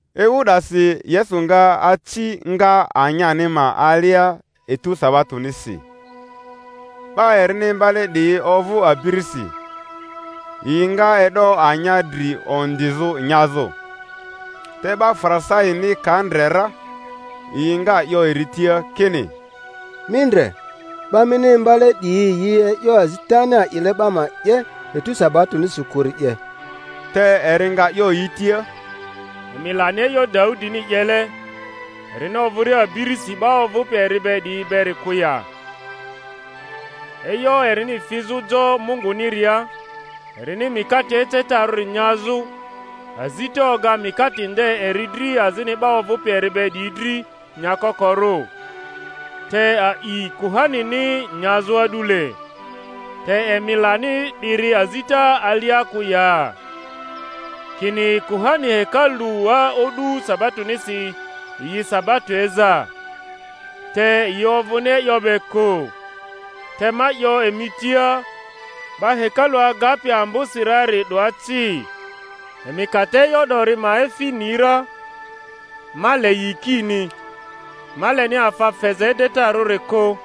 Ewu 'dasi Yesu nga aci nga anyani ma alia etu sabatonisi; 'ba erini imbale 'diyi ovᴜ abirisi, yi nga e'do anya dri ondizᴜ nyazᴜ. Te 'ba Farisaini ka ndre ra, yi nga 'yo eri tia kini, Mi ndre, 'ba mini imbale 'diyi yi e'yo azitani a'ile 'ba ma 'ye etu sabatonisi kᴜri 'ye. Te eri nga 'yo yi tia, Emi lani e'yo Daudini 'yele, erini ovᴜria abirisi, 'ba ovᴜpi eri be 'diyi beri kᴜ ya? e'yo erini fizᴜ jo Munguniria, erini mikate ecetarᴜri nyazᴜ; azita oga mikate nde eri dri azini 'ba ovᴜpi eri be 'diyi dri nyakokorᴜ, te a'i kuhanini nyazᴜ a'dule. Te emi lani 'diri azita alia kᴜ ya? kini kuhani hekalua o'du sabatonisi yi sabato eza, te yi ovᴜni e'yo be kᴜ. Te ma 'yo emi tia, 'ba hekalu agapi ambosi rari 'doa ci. Emi ka te e'yo 'dori ma efi ni ra, Ma le yikini, ma leni afa feza edetarᴜri kᴜ,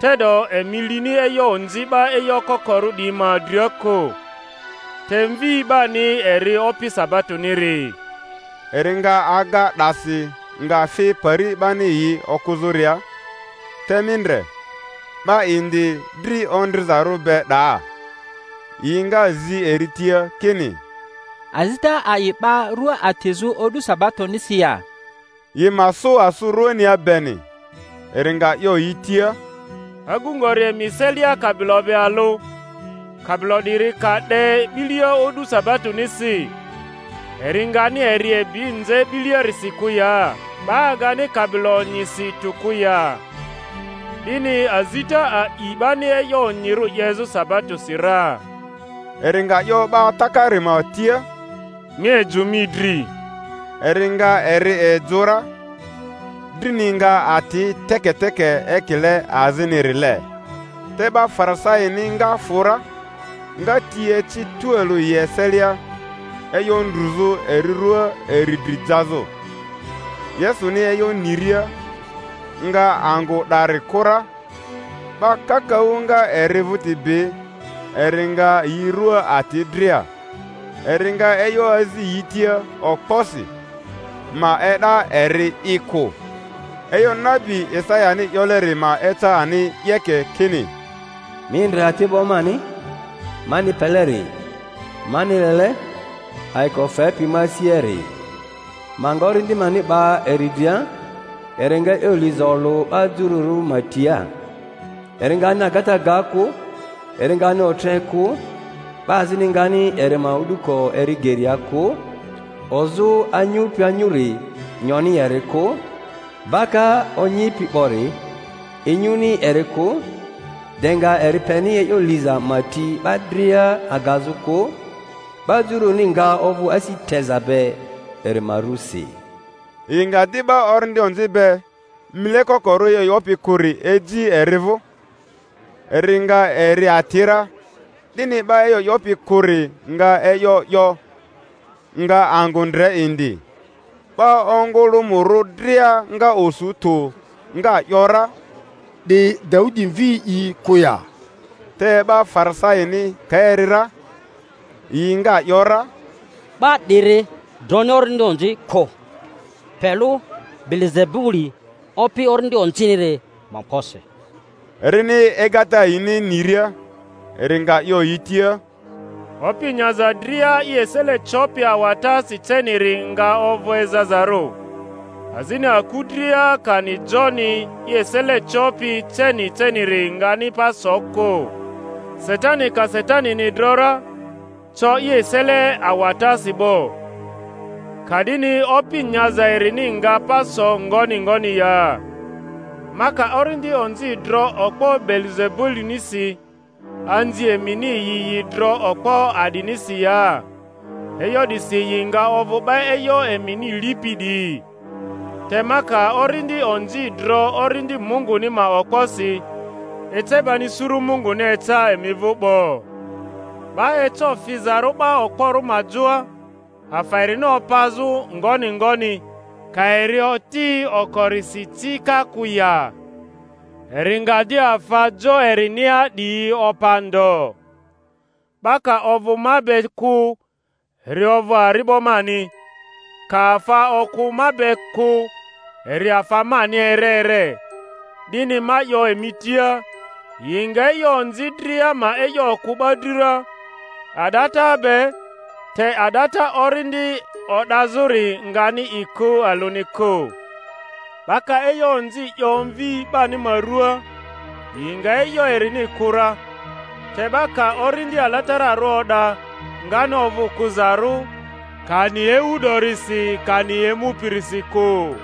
te'do emi lini e'yo onzi 'ba e'yo kokorᴜ 'diyi ma dria kᴜ. Te Mvi 'bani eri Opi sabatoniri. Eri nga aga 'dasi, nga fi pari 'bani yi okᴜzᴜria. Te mi ndre, 'ba indi dri ondrizarᴜ be 'daa. Yi nga zi eri tia kini, Azita a'i 'ba rᴜa atizᴜ o'du sabatonisi ya? —yi ma sᴜ asᴜ ruania beni. Eri nga 'yo yi tia, Agu ngori emi eselia kabilo be alᴜ, kabilo 'diri ka 'de 'bilia o'du sabatonisi, eri ngani eri ebi nze 'biliarisi kᴜ ya? 'Ba agani kabilo onyisi tᴜ kᴜ ya? 'Dini azita a'i 'bani e'yo onyirᴜ 'yezᴜ sabatosi ra. Eri nga 'yo 'ba takari ma tia, Mi ejᴜ mi dri. Eri nga eri ejᴜ ra; drini nga ati teketeke ekile azinirile. Te 'ba Farisaini nga fᴜ ra, nga ti eci tualᴜ yi eselia e'yo ndruzᴜ eri ruaa eri dri jazᴜ. Yesuni e'yo niria, ŋga angᴜ 'dari kᴜ ra. 'Ba kakaᴜ nga eri vᴜti bi; eri nga yi rua ati dria, eri nga e'yo azi yi tia okposi, ma e'da eri'i kᴜ. E'yo nabi Isayani 'yoleri ma eca ani 'yeke, kini: Mi ndre ati'bo mani, mani peleri, mani lele, ayiko fepi ma asiari. Ma nga Orindi mani 'ba eri dria, eri nga e'yo liza olᴜ 'ba jururᴜ ma tia. Eri ngani agata ga kᴜ, eri ngani otre kᴜ, 'ba azini ngani eri ma o'duko eri geria kᴜ; ozᴜ anyupi anyuri, nyoni eri kᴜ, baka onyipi 'bori, inyuni eri kᴜ, de nga eri peni e'yo liza ma ti 'ba dria agazᴜ kᴜ; 'ba juruni nga ovᴜ asi teza be eri ma rusi. Yi nga di 'ba orindi onzi be, mile kokorᴜ e'yo 'yopi kᴜri, eji eri vᴜ, eri nga eri ati ra, 'dini 'ba e'yo 'yopi kᴜri nga e'yo 'yo, nga angᴜ ndre indi. 'Ba ongᴜlᴜmᴜrᴜ dria nga osu tᴜ, nga ‘yora, 'Di Daudi mvi'i kᴜ ya? Te 'ba Farisaini ka eri ra, yi nga ‘yora, 'Ba 'diri droni orindi onzi kᴜ, pe lᴜ Beelizebuli opi orindi onziniri ma okposi. Erini egata yini niria, eri nga 'yo yi tia, Opi nyaza dria i esele copi awatasi ceniri nga ovᴜ ezazarᴜ, azini aku dria, kani joni, i esele copi ceni ceniri ngani pa so kᴜ; Satani ka Satanini dro ra, co i esele awatasi 'bo; ka'dini opi nyaza erini nga pa so ngoni ngoni ya? Ma ka orindi onzi dro okpo Beelizebulinisi, anzi emini yi yi dro okpo a'dinisi ya? E'yo 'disi yi nga ovᴜ 'ba e'yo emini lipi 'diyi. Te ma ka orindi onzi dro Orindi Munguni ma okposi, ece bani suru Munguni eca emi vᴜ 'bo. 'Ba eco fizarᴜ 'ba okporᴜ ma joa, afa erini opazᴜ, ngoni ngoni, ka eri oti okorisi ci ka kᴜ ya? Eri nga di afa jo erinia 'diyi opa ndo. 'Ba ka ovᴜ ma be kᴜ, eri ovᴜ ari'bo mani; ka afa okᴜ ma be kᴜ, eri afa mani ere ere. 'Dini ma 'yo emi tia, yi nga e'yo onzi dria ma e'yo kᴜ 'ba dri ra, a'data be, te a'data Orindi o'dazᴜri ngani i kᴜ alᴜni kᴜ. 'Ba ka e'yo onzi 'yo Mvi 'bani ma ruaa, yi nga e'yo erini kᴜ ra; te 'ba ka Orindi Alatararᴜ o'da, ngani ovᴜ kᴜzarᴜ, kani ewu 'dorisi, kani emupirisi kᴜ.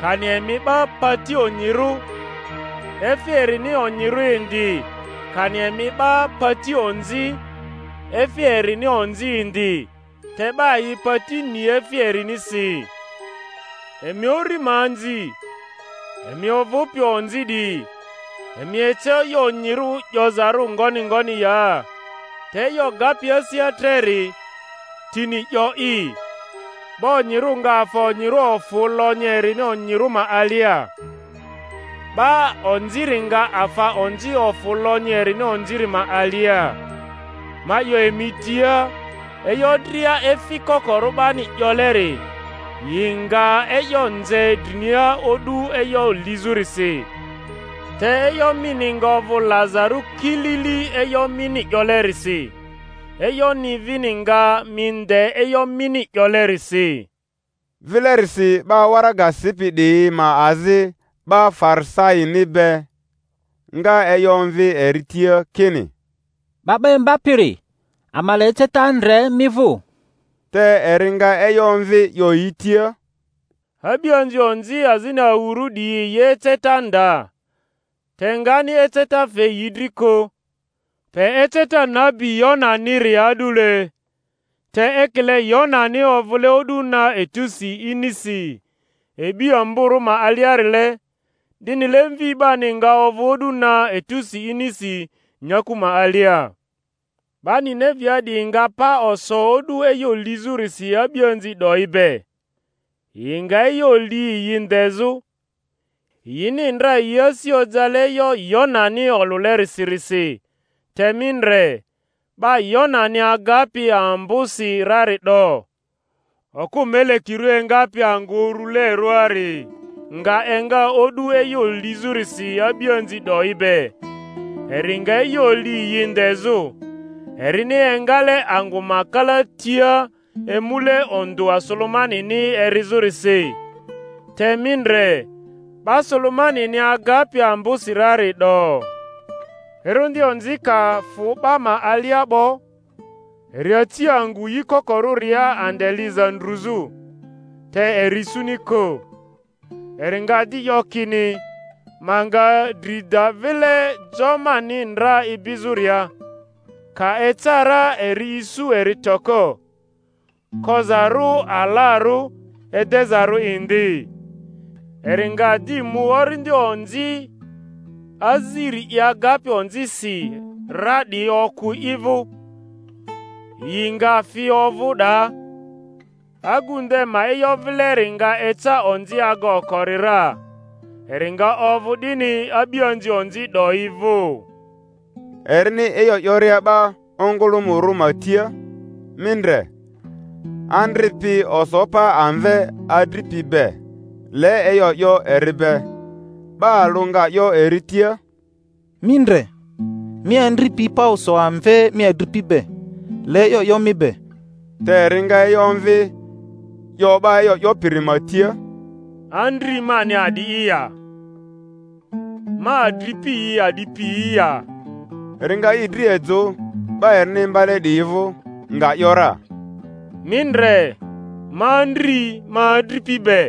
Kani emi 'ba pati onyirᴜ, efi erini onyirᴜ indi; kani emi 'ba pati onzi, efi erini onzi indi; te 'ba yi pati ni efi erinisi. Emi uri ma anzi! Emi ovᴜpi onzi 'diyi, emi eco e'yo onyirᴜ 'yozarᴜ ngoni ngoni ya? Te e'yo gapi asia treri, tini 'yo'i. 'Ba onyirᴜ nga afa onyirᴜ ofᴜ lonyi erini onyirᴜ ma alia, 'ba onziri nga afa onzi ofᴜ lonyi erini onziri ma alia. Ma 'yo emi tia, e'yo dria efi kokorᴜ 'bani 'yoleri, yi nga e'yo nze drinia o'du e'yo lizᴜrisi; te e'yo mini nga ovᴜ lazarᴜ kilili e'yo mini 'yolerisi, e'yoni vini nga mi nde e'yo mini 'yolerisi. Vilerisi 'ba waraga sipi 'diyi ma azi 'ba Farisaini be nga e'yo omvi eri tia kini, 'Ba 'ba Imbapiri, ama le eceta ndre mi vᴜ. Te eri nga e'yo omvi, 'yo yi tia, A'bianzi onzi azini awurᴜ 'diyi yi eceta nda; te ngani eceta fe yi dri kᴜ, pe eceta nabi Yonaniri a'dule. Te ekile Yonani ovᴜle o'du na etusi inisi e'bi amborᴜ ma aliarile, 'dinile Mvi 'bani nga ovᴜ o'du na etusi inisi nyaku ma alia. 'Ba Ninevea 'diyi nga pa oso o'du e'yo lizᴜrisi a'bianzi 'doyi be, yi nga e'yo li yi ndezᴜ, yini ndra yi asi ojale e'yo Yonani olᴜlerisirisi te mi ndre, 'ba Yonani agapi ambosi rari 'do! Okᴜ melekirᴜ engapi angᴜ urulerᴜari nga enga o'du e'yo lizᴜrisi a'bianzi 'doyi be, eri nga e'yo li yi ndezᴜ, erini engale angᴜ ma kalatia emule ondᴜa Sulemanini erizᴜrisi; te mi ndre, 'ba Sulemanini agapi ambosi rari 'do! Orindi onzi ka fᴜ 'ba ma alia 'bo, eri aci angᴜ yi kokorᴜria ande liza ndruzᴜ, te eri isuni kᴜ. Eri nga di 'yo kini, Ma nga dri da vile, jo mani ndra ibizᴜria; ka eca ra eri isu eri toko, kozarᴜ alarᴜ, edezarᴜ indi. Eri nga di mu orindi onzi aziri i agapi onzisi ra 'diyi okᴜ i vᴜ, yi nga fi ovᴜ 'daa; agu nde ma e'yo vileri nga eca onzi aga okori ra. Eri nga ovᴜ 'dini a'bianzi onzi 'doyi vᴜ. Erini e'yo 'yoria 'ba ongᴜlᴜmᴜrᴜ ma tia, mi ndre, andri pi oso pa amve adripi be, le e'yo 'yo eri be. 'Ba alᴜ nga 'yo eri tia, Mi ndre, mi andri pi pa oso amve mi adripi be, le e'yo 'yo mi be. Te eri nga e'yo omvi, 'yo 'ba e'yo 'yopiri ma tia, Andri mani a'di'i ya? Ma adripi yi a'di piyi ya? Eri nga i dri ejᴜ 'ba erini imbale 'diyi vᴜ, nga ‘yora, Mi ndre, ma andri ma adripi be.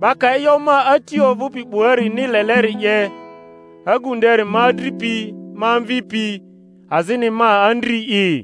'Ba ka e'yo ma Ati ovᴜpi 'buarini leleri 'ye, agu nderi ma adripi, ma amvipi, azini ma andri'i.